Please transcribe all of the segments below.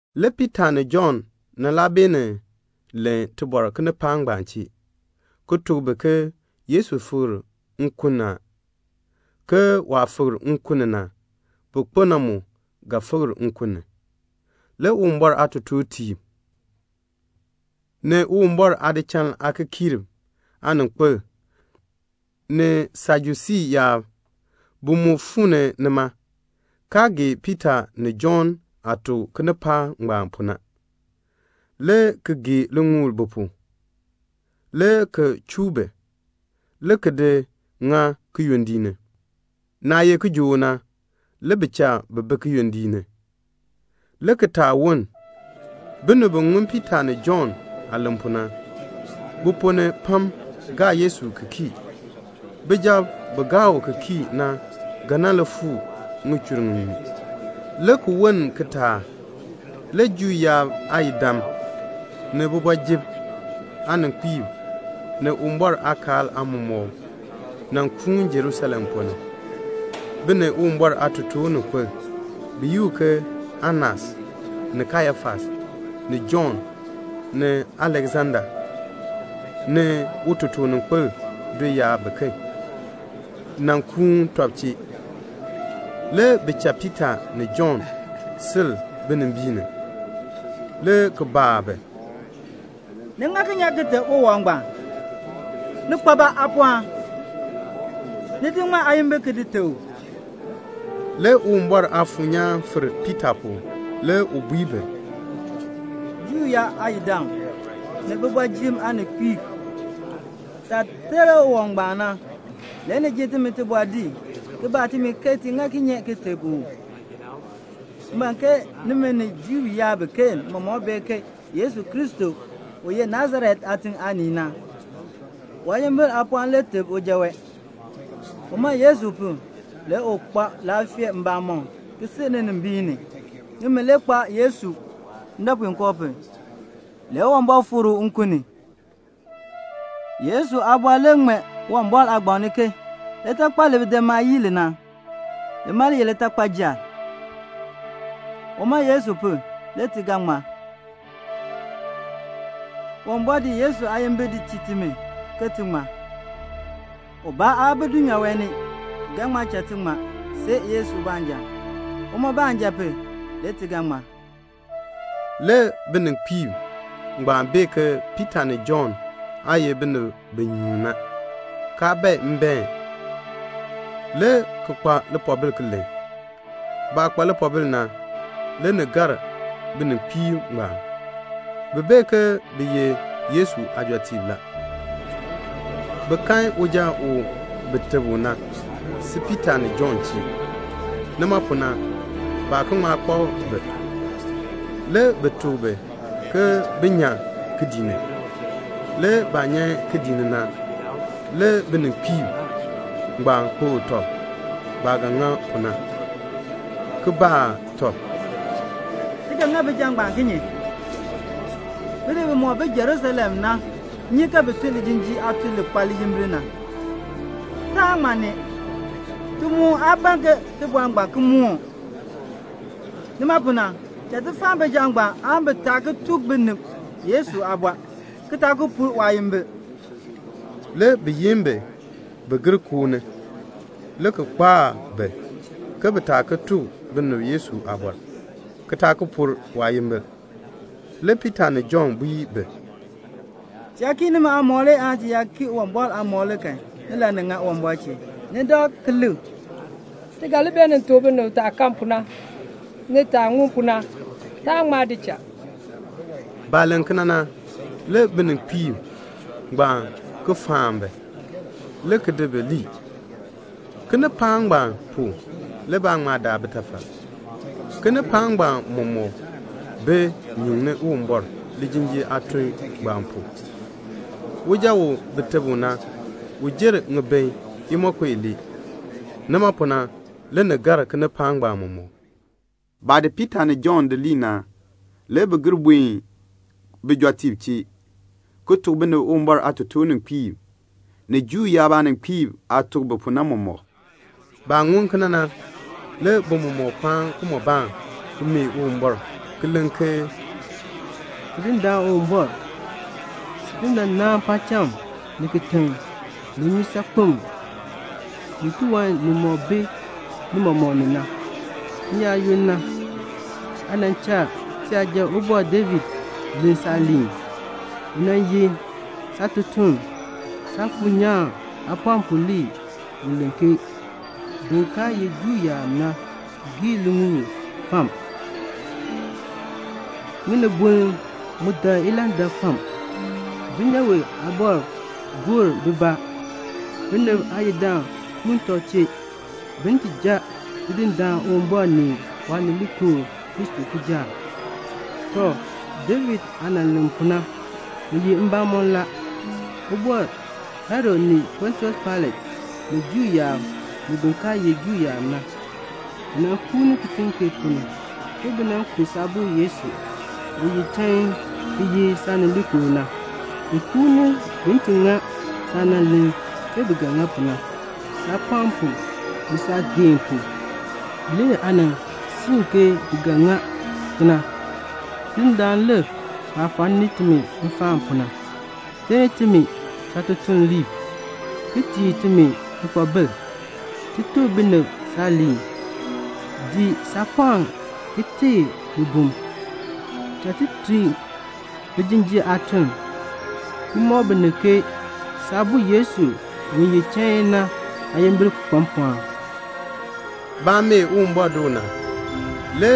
Le Piita ni Jɔnn nan laa beenin len tibɔr kinipaak ngbaan chee, ki tuk bi ke Yesu fikr nkun ni a, ke waah fikr nkun ni na, bi kpo na mu ga fikr nkun ni. Le Uwumbɔr aatotoortiib, ni Uwumbɔr aadichal aakikiirb aaninkpil, ni Sajusii yaab, bi mu fuu ni nima, kaa gee Piita ni Jɔnn aah tuk kinipaak ngbaan pu na, le ki gee liŋuul bi pu, le ki chuu bi, le ki di ŋa kiyondiik ni. Naah ye kijook na, le bi cha bi bi kiyondiik ni, le kitaak woln. Binib bi ŋun Piita ni Jɔnn aah len pu na, bi ponn ni pam gaa Yesu ki kii la. Bijab bi gaa u ki kii na ga nan li fuu ŋichur ŋiŋmu la. Le ki woln kitaak, le Juu yaab aayidam, ni kooti ni aaninkpiib, ni Uwumbɔr aakaal aamɔmɔkb nan kuun Jerusalem ponn ni. Bi ni Uwumbɔr aatotoorninkpil bi yi u ke Anas, ni Kayafas, ni Jɔnn, ni Aleksanda, ni utotoorninkpil do yaab biken, nan kuun tɔb chee. Le bi cha Piita ni Jɔnn sil binimbiin ni, le ki baa bi, "Ni ŋa kinye aan ki teb uwɔb ngbaan? Ni kpa ba aapɔɔn? Ni di ŋmaa aayimbil ki di teb u?" Le Uwumbɔr Aafuur nyaan fir Piita pu. Le u bui bi, "Juu yaab aayidam, ni kooti ni aaninkpiib, taah ter uwɔb ngbaan na, le ni ji timi tibɔr din, ki baa timi ke ti ŋa kinye ki teb u. M ban ke nimi ni Juu yaab biken mɔmɔk bee ke Yesu Kristo, u ye Nasaret aatiŋ aanii na, waayimbil aapɔɔn le teb uja wee. Uma Yesu pu, le u kpa laafee mbamɔm, ki sil ninimbiin ni. Nimi le kpaa Yesu ndɔpuinkoo pu. Le Uwumbɔr fikr u nkun ni. Yesu aabɔr le ŋmee Uwumbɔr aagbaŋ ni ke 'Litakpal li bidimaab yii li na, lima le ye litakpayil.' Uma Yesu pu, le ti ga ŋmar. Uwumbɔr di Yesu aayimbil di tii timi, ke ti ŋmar. Ubaa aa bi dulnyaa wee ni ki ga ŋma cha ti ŋmar see Yesu baanja. Uma baanja pu, le ti ga ŋmar." Le bininkpiib ngbaan bee ke Piita ni Jɔnn aa ye binib bi nyuun na, kaa bae mbaen, le ki kpa lipoobil ki len. Baah kpa lipoobil na, le ni gar bininkpiib ngbaan. Bi bee ke bi ye Yesu aajɔtiib la. Bi kan uja u bi teb u na, si Piita ni Jɔnn chee. Nima pu na, baa ki ŋma kpak bi. Le bi tuk bi ke bin nyan kidiik ni. Le baah nyan kidiik ni na, le bininkpiib ngbaan kpokl tɔb baah ga ŋa pu na, ki baa tɔb, "Ti ga ŋa bijab ngbaan kinye? Binib bimɔk bi Jerusalem na nyi ke bi tun lijinjiir aatuln li kpa liyimbil na. Taan ŋma nee. Ti mu aa ban ke tibɔr ngbaan ki moon. Nima pu na, cha ti faan bijab ngbaan aan bi taa ki tuk binib Yesu aabɔr, ki taa ki pur waayimbil." Le bi yin bi ke bin gir koo ni, le ki kpaa bi ke bi taa ki tuk binib Yesu aabɔr, ki taa ki pur waayimbil. Le Piita ni Jɔnn bui bi, "Ti yaa kii nimi aamɔb le aan ti yaa kii Uwumbɔr aamɔb la kan, nilani ŋan Uwumbɔr chee? Ni dak ki lik. Ti ga li beenin tuk binib taah kan pu na, ni taah ŋun pu na. Taan ŋma di cha." Baah len kena na, le bininkpiib ngbaan ki faan bi, le ki di bi lii. Kinipaak ngbaan pu le baa ŋma daa bitafal. Kinipaak ngbaan mɔmɔk bi nyuŋni Uwumbɔr, lijinjiir aatuln ngbaan pu. Uja u bi teb u na, u jer ŋibin imonko ilee. Nima pu na, le ni gar kinipaak ngbaan mɔmɔk. Baah di Piita ni Jɔnn di lii na, le bi gir buen bijɔtiib chee, ki tuk bi Uwumbɔr aatotoorninkpiib ni Juu yaab aaninkpiib aah tuk bi pu na mɔmɔk. Baah ŋun kena na, le bi mɔmɔk kpaan kimɔbaan, ki mee Uwumbɔr, ki len ke, "Tidindaan Uwumbɔr, sin le nan naan paacham, ni kitiŋ, ni nnyusaakpem, ni tiwan nimɔk bi ni mɔmɔk ni na. N-yaayoonn na, aa nan cha tiyaja Ubɔr David len saaliin. U nan ye saatutuln. Saafuur nyaan aapɔɔn pu le u len ke 'Bin kaa ye Juu yaab na gee liŋuul fam. Ŋinibol mu dak ilandak fam. Dulnyaa aabɔrb gor bibaa, binib aayidam kuun tɔb chee, bin ti jan Tidindaan Uwumbɔr ni Waanileekoo Kristo kijaak.' Tɔ, David aah nan len pu na, ni ye mbamɔn la. Ubɔr Herod ni Pontius Pailat, ni Juu yaab, ni bin kaa ye Juu yaab na, bi nan kuun kitiŋ kee ponn ni, bi nan ku Saabo Yesu, u ye chain ki ye Saanileekoo na. Bi kuun bin ti ŋa saah nan len ke bi ga ŋa pu na. Saapɔɔn pu ni saageehn pu, le aa nan siin ke bi ga ŋa kena. Tidindaan, lik baah faani timi nfaan pu na. Ter timi saatutuliib, ki tii timi lipoobil, ti tuk binib saaliin. Di saapɔɔn ki teei bibum. Cha ti tun lijinjiir aatun, ki mɔk binib ke Saabo Yesu u ye chain na aayimbil kpa mpɔɔn." Baah mee Uwumbɔr doo na, le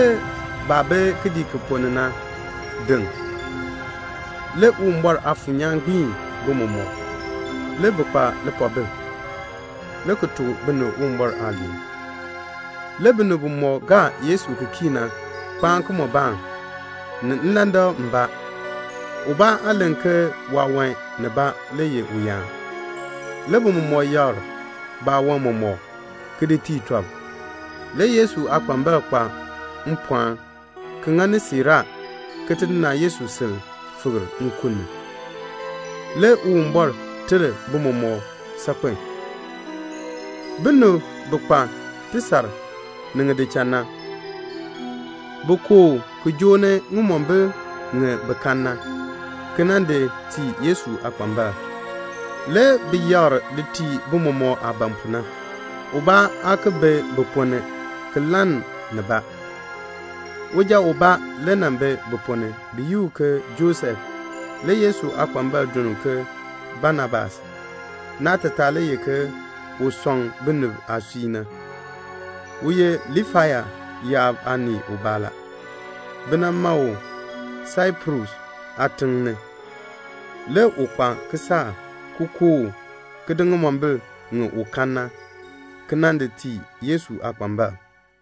baah bi kidiik ki ponn ni na deŋ. Le Uwumbɔr Aafuur nyaan gbiin bi mɔmɔk. Le bi kpa lipoobil, le ki tuk binib Uwumbɔr aaliin. Le binib bimɔk gaa Yesu ki kii na kpaan kimɔbaan, ni nlandak mbaa. Ubaa aa len ke waawan nibaa le ye uyaan. Le bi mɔmɔk yakr baawan mɔmɔk, ki di tii tɔb. Le Yesu aakpambalb kpa mpɔɔn ki ŋani siiraa ke Tidindaan Yesu sil fikr nkun ni. Le Uwumbɔr ter bi mɔmɔk saakpen. Binib bi kpa tisar ni ŋidichal na, bi kooh ki joo ni ŋimombil ŋi bi kan na, ki nan di tii Yesu aakpambalb. Le bi yakr di tii bimɔk aah ban pu na. Ubaa aa ki bi bi ponn ni ki lann nibaa. Uja ubaa le nan bi bi ponn ni, bi yi u ke Josef. Le Yesu aakpambalb duln u ke Banabas. (Naatataa le ye, "Un sɔŋ binib aasui na.") U ye Liifai yaab aanii ubaa la. Bi nan ma u Saiprus aatiŋ ni. Le u kpa kisaak, ki kooh, ki di ŋimombil ŋi u kan na, ki nan di tii Yesu aakpambalb.